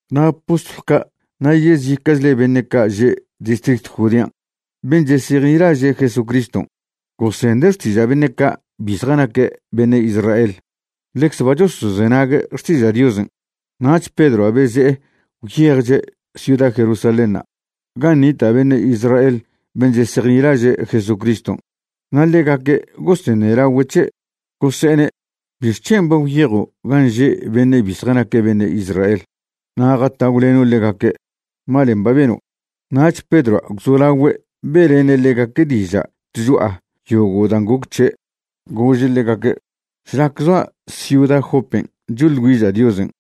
Na' postlw ca' na' yezica'chle beṉe' ca' že' distritw Judean' ben' chesejnilaže' Jesucriston' gosende' xtiža' beṉe' ca' bi zjanaque' beṉe' Israel ḻecze ba chosozenague' xtiža' Diosen'. Nach Pedroa' beze'e gwyejche' ciuda Jerusalénṉa' gan' nita' beṉe' Israel ben' chesejnilaže' Jesucriston' na' ḻegaque' goseṉelagüe' c̱he', gose'ene': ―¿Bixc̱hen' ba gwyejo' gan' že' beṉe' cbi zjanaque' beṉe' Israel na' jatagwleno' ḻegaque'? Malen' ba beno'. Nach Pedroa' gwzolagüe' be'lene' ḻegaque' diža' tcho'a yogo' dan' goc c̱he', gože' ḻegaque': ―Šlac zoa' ciuda Jopen' choḻ güiža' Diosen',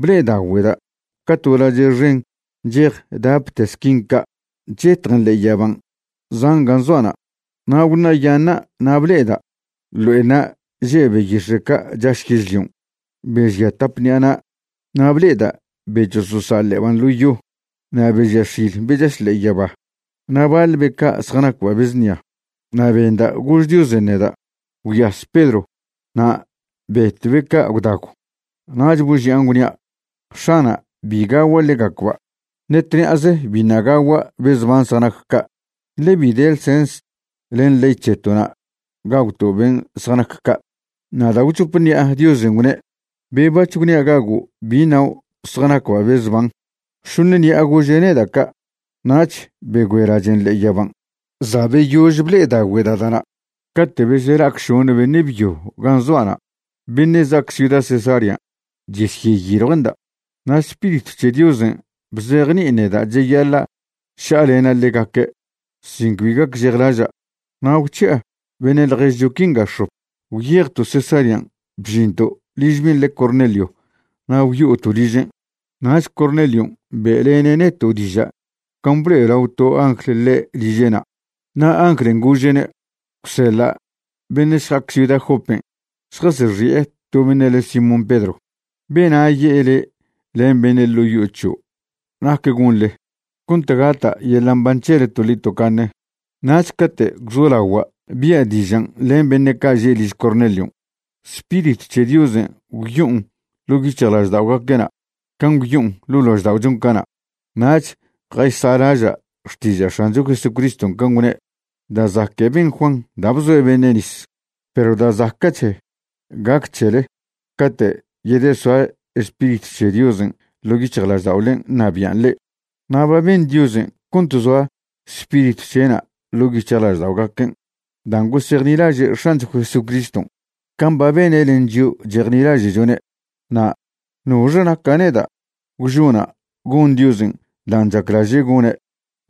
ble'edagüeda' ca to lache' xen nchej dapte squin ca' chetjen ḻe'e yaban' zan' gan' zoa'na'. Na' gwṉa'yaṉa' na' ble'eda' ḻo'enṉa' že' beyix̱e' ca' chaš yežlion' be žia tap ṉi'a na', na' ble'eda' be chososa' ḻe'eban' ḻo yo, na' be žia x̱il be chaš ḻe'e yaba, na' baḻ be ca' zjanacba' be znia. Na' benda' gož Diosen' neda': “Gwyas Pedro, na' betw be ca' gwdagw.” Nach boži'an gwnia': “X̱ana', bi gagua' ḻegacba'. Ṉe tṉi'aze biṉa' gagua' be zban zjanac ca', ḻe bi de ḻsens len ley c̱heto'na' gagwto' ben' zjanac ca'.” Na' da' gwchop ṉi'a Diosen' gwne': “Be bac̱h gwnia' gago' bi ṉao' zjanacba' be zban.” Šoṉ ṉi'a gože' neda' ca' nach begüe lachen' ḻe'e yaban'. Za' beyož ble'edagüeda' da'na' cate' besela'ac šoṉe beṉe' byo gan' zoa'na' beṉe' za'ac ciuda Cesarean' chesyeyiljue'nda'. Na' Spiritw c̱he Diosen' bzejni'in neda' cheyaḻa' ša'alena' ḻegaque' sin cbi gacžejlaža', na' gwc̱hi'a beṉe' ḻježcho quinga x̱op, gwyejto' Cesarean' bžinto' liž ben' le Cornelio na' gwyo'oto' ližen'. Nach Cornelion' be'lene' neto' diža' can' blo'elao to angl ḻe' liže'na' na' anglen' gože'ne': “Gwseḻa' beṉe' šja'ac ciuda Jopen' šjasexi'e to beṉe' le Simón Pedro. Bena' ye'e le' len beṉe' ḻo' yo'o c̱hio' nac gonḻe cont gata' yeḻa' mban c̱hele toḻi tocaṉe.” Nach cate' gwzolagua' bia' dižan' len beṉe' ca' že' liž Cornelion', Spiritw c̱he Diosen' gwyo'on ḻo' yic̱hjlažda'ogaque'na' can' gwyo'on ḻo' lažda'ochon' cana'. Nach jaysa'laža' xtiža' X̱ancho Jesucriston' can' gwne': “Da' zaque' ben Juan da' bzoe' beṉe' nis, perw da' zaca'che' gac c̱hele cate' yedesoa Spiritw c̱he Diosen' ḻo' yic̱hjlažda'olen' ṉabi'an le'e.” Na' ba ben Diosen' cont zoa Spiritw c̱he'na' ḻo' yic̱hjlažda'ogaquen' dan' gosejnilaže' X̱ancho Jesucriston' can' ba bene' len chio' chejnilaže'chone', na' ¿nox naca' neda' gwžona' gon Diosen' dan' chaclaže' gone'?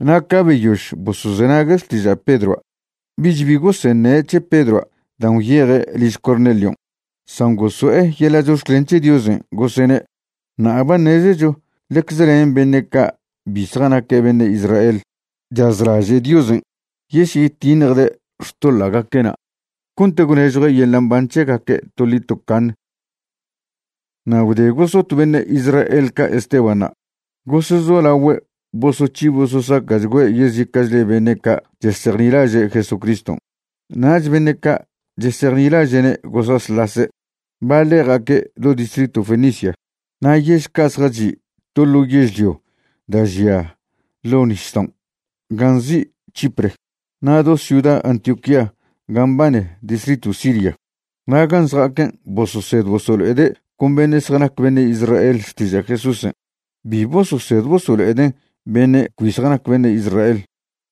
Na' ca beyož bosozenague' xtiža' Pedroa' bich bi goseṉe' c̱he Pedroa' dan' gwyeje' liž Cornelion', san goso'e yeḻa' chox̱clen c̱he Diosen', gosene': ―Ṉa'a ba ṉezecho ḻecze len beṉe' ca' bi zjanaque' beṉe' Israel chazlaže' Diosen' yesyetiṉjde' xtoḻa'gaque'na' cont gwnežjue' yeḻa' mban c̱hegaque' toḻi tocaṉ. Na' gwde gosot beṉe' Israel ca' Estebanṉa', gosezolagüe' bosoc̱hi bososaca'chgüe' yezica'chle beṉe' ca' chesejnilaže' Jesucriston', nach beṉe' ca' chesejnilaže'ne' gosasḻase'. Baḻe' ja'aque' do distritw Fenicia, na' yež ca' zjachi' to ḻo yežlio da' žia ḻo' nisdaon' gan' nzi' Chipre na' do ciuda Antioquía ga mbane distritw Siria. Na' gan' zja'aquen' bososed bosolo'ede' con beṉe' zjanac beṉe' Israel xtiža' Jesúsen', bi bososed bosolo'eden' beṉe' cbi zjanaque' beṉe' Israel.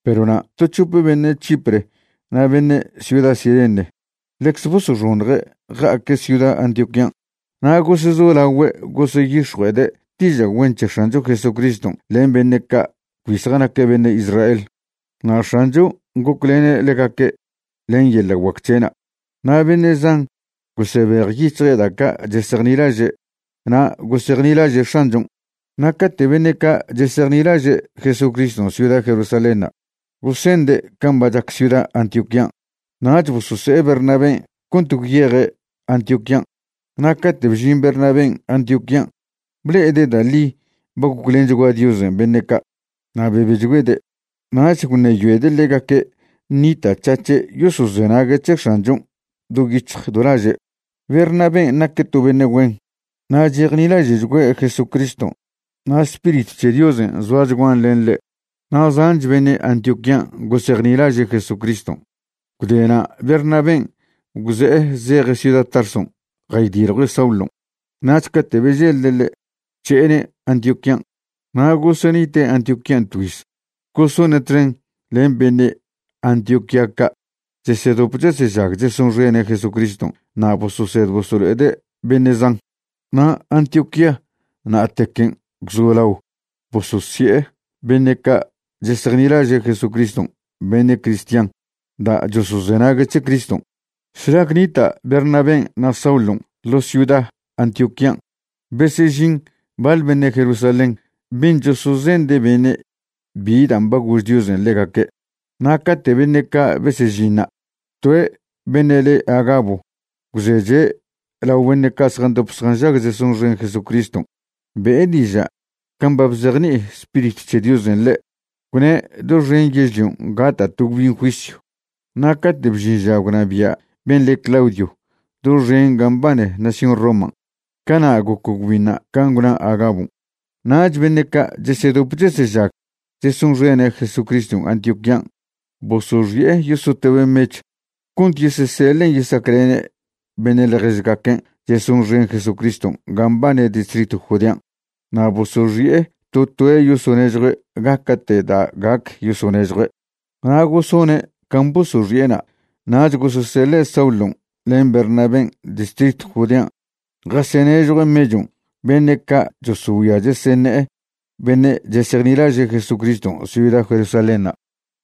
Perw na' to c̱hope beṉe' Chipre na' beṉe' ciuda Cirene ḻecze bosoxoṉje' ja'aque' ciuda Antioquían', na' gosezolagüe' goseyix̱jue'ede' diža' güen c̱he X̱ancho Jesucriston' len beṉe' ca' cbi zjanaque' beṉe' Israel. Na' X̱anchon' goclene' ḻegaque' len yeḻa' guac c̱he'na' na' beṉe' zan gosebejyic̱hje' da' ca' chesejnilaže' na' gosejnilaže' X̱anchon'. Na' cate' beṉe' ca' chesejnilaže' Jesucriston' ciuda Jerusalénṉa' gosende' can' ba chac ciuda Antioquían', nach bosose'e Bernabén' cont gwyeje' Antioquían'. Na' cate' bžin Bernabén' Antioquían', ble'ede' da' ḻi ba goclenchgua Diosen' beṉe' ca', na' bebechgüede'. Nach gwṉeyoede' ḻegaque' ṉita'c̱hac̱he' yosozenague' c̱he X̱anchon' do yic̱hj do laže'. Bernabén' naque' to beṉe' güen, na' chejnilaže'chgüe' Jesucriston' na' Spiritw c̱he Diosen' zoachguan len ḻe'. Na' zanch beṉe' Antioquían' gosejnilaže' Jesucriston'. Gwde na' Bernabén' gwze'e zeje' ciuda Tarson' jaydiljue' Saulon', nach cate' beželde' ḻe', gwc̱he'ene' Antioquían'. Na' gosenite' Antioquían' tgüiz gosone' txen len beṉe' Antioquía ca' chesedop chesežag chesonxene' Jesucriston' na' bososed bosolo'ede' beṉe' zan. Na' Antioquía na'tequen' gwzolao bososi'e beṉe' ca' chesejnilaže' Jesucriston' beṉe' cristian da' chosozenague' c̱he Criston'. Šlac nita' Bernabén' na' Saulon' ḻo ciuda Antioquían', besežin baḻ beṉe' Jerusalén ben' chosozende' beṉe' bi dan' ba gož Diosen' ḻegaque'. Na' cate' beṉe' ca' besežinṉa', toe' beṉe' le Agabo gwzeche' lao beṉe' ca' zjandop zjanžag chesonxen Jesucriston' be'e diža' can' ba bzejni'i Spiritw c̱he Diosen' ḻe', gwne' doxen yežlion' gata' to gwbin juisyw. Na' cate' bžin ža gwnabia' ben' le Claudio doxen gan' mbane nación Roman', cana' goc gwbinṉa' can' gwna Agabon'. Nach beṉe' ca' chesedop chesežag chesonxene' Jesucriston' Antioquían' bosoxi'e yosotobe' mechw cont yeseseḻen' yesaclene' beṉe' ḻježgaquen' chesonxen Jesucriston' gan' mbane distritw Judean'. Na' bosoxi'e to toe' yosonežjue' gaca'te' da' gac yosonežjue'. Na' gosone' can' bosoxi'ena' nach goseseḻe' Saulon' len Bernabén' distritw Judean' jasenežjue' mechon' beṉe' ca' chosogüia cheseṉe'e beṉe' chesejnilaže' Jesucriston' ciuda Jerusalénṉa'.